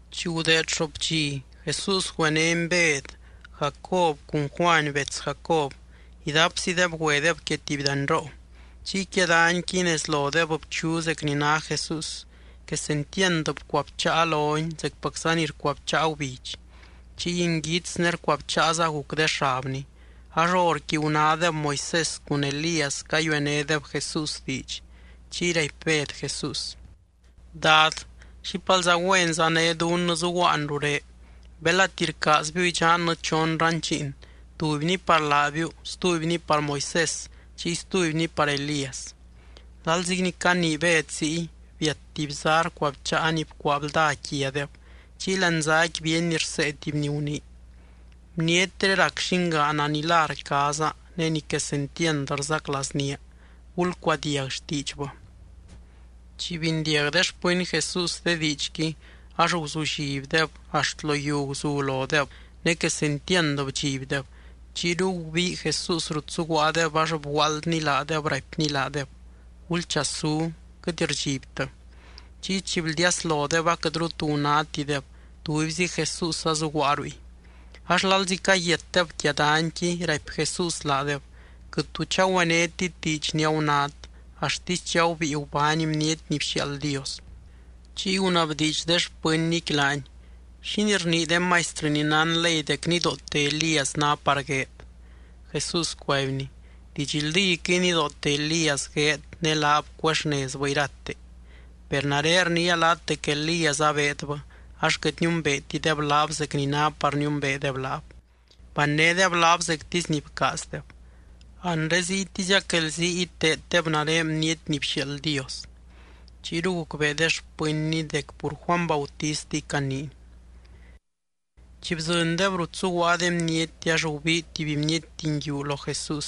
Chi gudeed xoop dxi, Jesús güenény Bed, Jacob cun Juany bets Jacob, idapzideb güedeb quia tuby danyroo. Chiy quia danyqui, nez lodeb bchu zec ni ná Jesús. Quesentiand bcuabcháa lony zecpacza ni rcuabcháa gubidx, chiy nguits ne rcuabcháaza guc de xabny. Ax horqui gunádeb Moisés cun Elías cayuenédeb Jesús diidx. Chiy raipy Bed Jesús: —Dad, ¡xípalza güenza né dunnɨ zuguaan rurén! Belati rcaazbiu idxannɨ chon ranchiin, tubyni par laabiu, stubyni par Moisés chiy stubyni par Elías. Lalzi ni canii Bed ziy, biat tuby zá rcuabcháa ni bcuaa blda quiadeb, chiy láani záqui bíeny rsee tuby ni gunii: —Bnietré rac llingaana ni lá rcaaza, ne ni quesentiand rzaclaaznía. Gulcuadiag xtiidxbɨ. Chi bindiag de xpɨny Jesús de diidxqui ax guzullibdeb axt lo yiu guzu lodeb, ne quesentiand bdxibdeb. Chiyru gubii Jesús rut zuguaadeb ax bguaaldny laadeb, raipny laadeb: —Gulchasú, quɨt rdxibtɨ. Chiy chi bldiaslodeb aquɨtru tu gunátideb, tubyzi Jesús azuguaa ruy. Ax lalzi cayiatdeb quia danyqui, raipy Jesús laadeb: —Quɨt tu chagüenétit diidx ni agunát, axtisy chi agubíi gubány Bniety ni bxiaald Dios. Chiy gunabdiidx de xpɨnnyqui laany: —¿Xínii rnii de maistrɨ ni nán ley dec nidoote Elías ná par gueed? Jesús cuaibny: —Didxldíquɨy nidoote Elías gueed ne laab cuexnezbɨ irate. Per nare rniia laat dec Elías abeedbɨ, ax quɨt niumbeetideb laab zec ni ná par niumbeedeb laab, bannédeb laab zectisy ni bcaazdeb. Anre ziytiziac guelzii iteeddeb nare Bniety ni bxiaald Dios. Chiyru gucbee de xpɨnny dec pur Juany Bautistiy caniiny. Chi bdzɨndeb rut zuguaa de bniety ax gubii tuby bniety nguiu lo Jesús,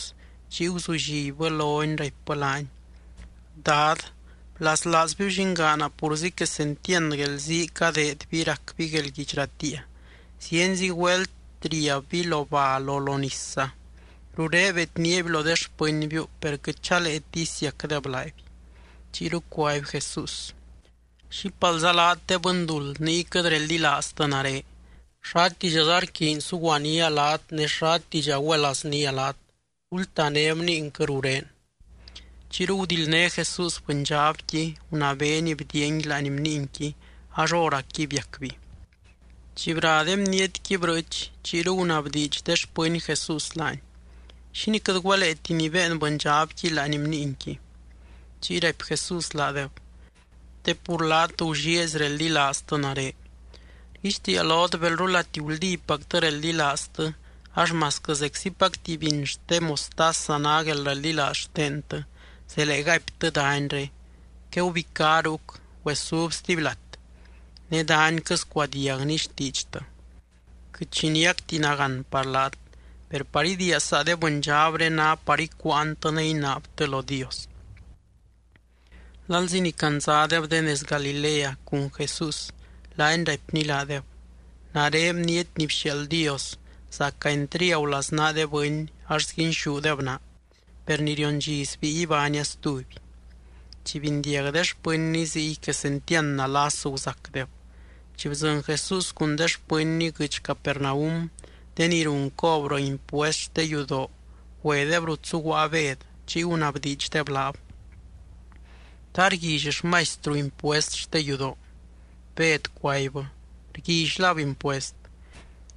chiy guzullibbɨ lony raipbɨ laany: —Dad, blaslaazbiu llingaana purzi quesentiand guelzii cadeedby racby guelguidx ratiia. Zienzi güelt riabby lo bal o lo nisza. Ruré bedníaby lo de xpɨnbiu, per quɨt chaleeti isiacdeb laaby. Chiyru cuaby Jesús: —¿Xípalza laat de bɨnduld niy quɨt reldilaaztɨ nare? ¡Xátidxaza rquiiny suguanía laat ne xátidxa güelaaznía laat! Gultané bniinquɨ rurén. Chiyru gudildné Jesús bɨndxabqui, gunabeeny bdiiangui láani bniinqui ax hóracqui biacby. Chi bra de bnietqui brɨɨch, chiyru gunabdiidx de xpɨny Jesús laany: —¿Xínii quɨt güeleeti nibéen bɨndxabqui láani bniinqui? Chiy raipy Jesús laadeb: —Te pur laat gullieezy reldilaaztɨ nare. Rguixtiia lot belrulati guldípactɨ reldilaaztɨ ax masquɨ zeczipac tuby biny xte mostaza ná guelreldilaaz xtentɨ, zelee gaiptɨ danyré: “Quegubicá ruc, güesub stuby lat”, ne danyquɨ scuadiagni xtiidxtɨ. Quɨt xi niacti nagán par laat. Per par idiia saa de bɨndxabré ná par icuuantɨ ne inaabtɨ lo Dios. Lalzi ni candzadeb de nez Galilea cun Jesús, laany raipny laadeb: —Nare Bniety ni bxiaald Dios, zaca entriagu laznaa de bɨny ax sguinxúdeb naa. Per ni rion dxi sbíi ibánia stuby. Chi bindiag de xpɨnny ziy quesentiand nalas guzacdeb. Chi bdzɨny Jesús cun de xpɨnny guɨdx Capernaum, de ni run cobrɨ impuest xte yudoo güedeb rut zuguaa Bed chiy gunabdiidxdeb laab: —¿Ta rguilly xmaistru impuest xte yudoo? Bed cuaibbɨ: —Rguillylab impuest.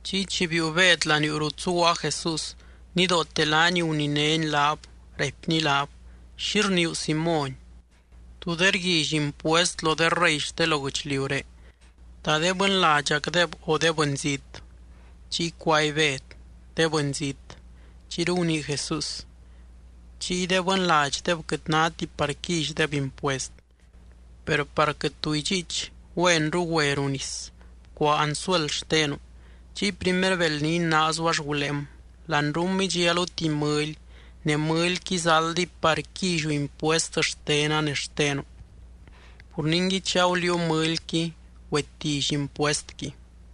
Chiy chi biiu Bed laniuu rut zuguaa Jesús, nidoote laany guninény laab, raipny laab: —¿Xi rniiu Simóny? ¿Tú de rguilly impuest lo de rey xte lo guɨchliuré? ¿Ta de bɨnladxacdeb o de bɨnzít? Chiy cuaby Bed: —De bɨnzít. Chiyru gunii Jesús: —Chiy de bɨnladxdeb quɨt náti par quillydeb impuest. Per par quɨt tu idxiich, güenru güe ruu nis, bcuaa anzuel xtenu. Chiy primer beld ni inaazu ax guléem. Lanruum idxialu tuby mɨly, ne mɨlyqui zaldiy par quilliu impuest xtena ne xtenu. Pur ningui chi aguliiu mɨlyqui, güetilly impuestqui.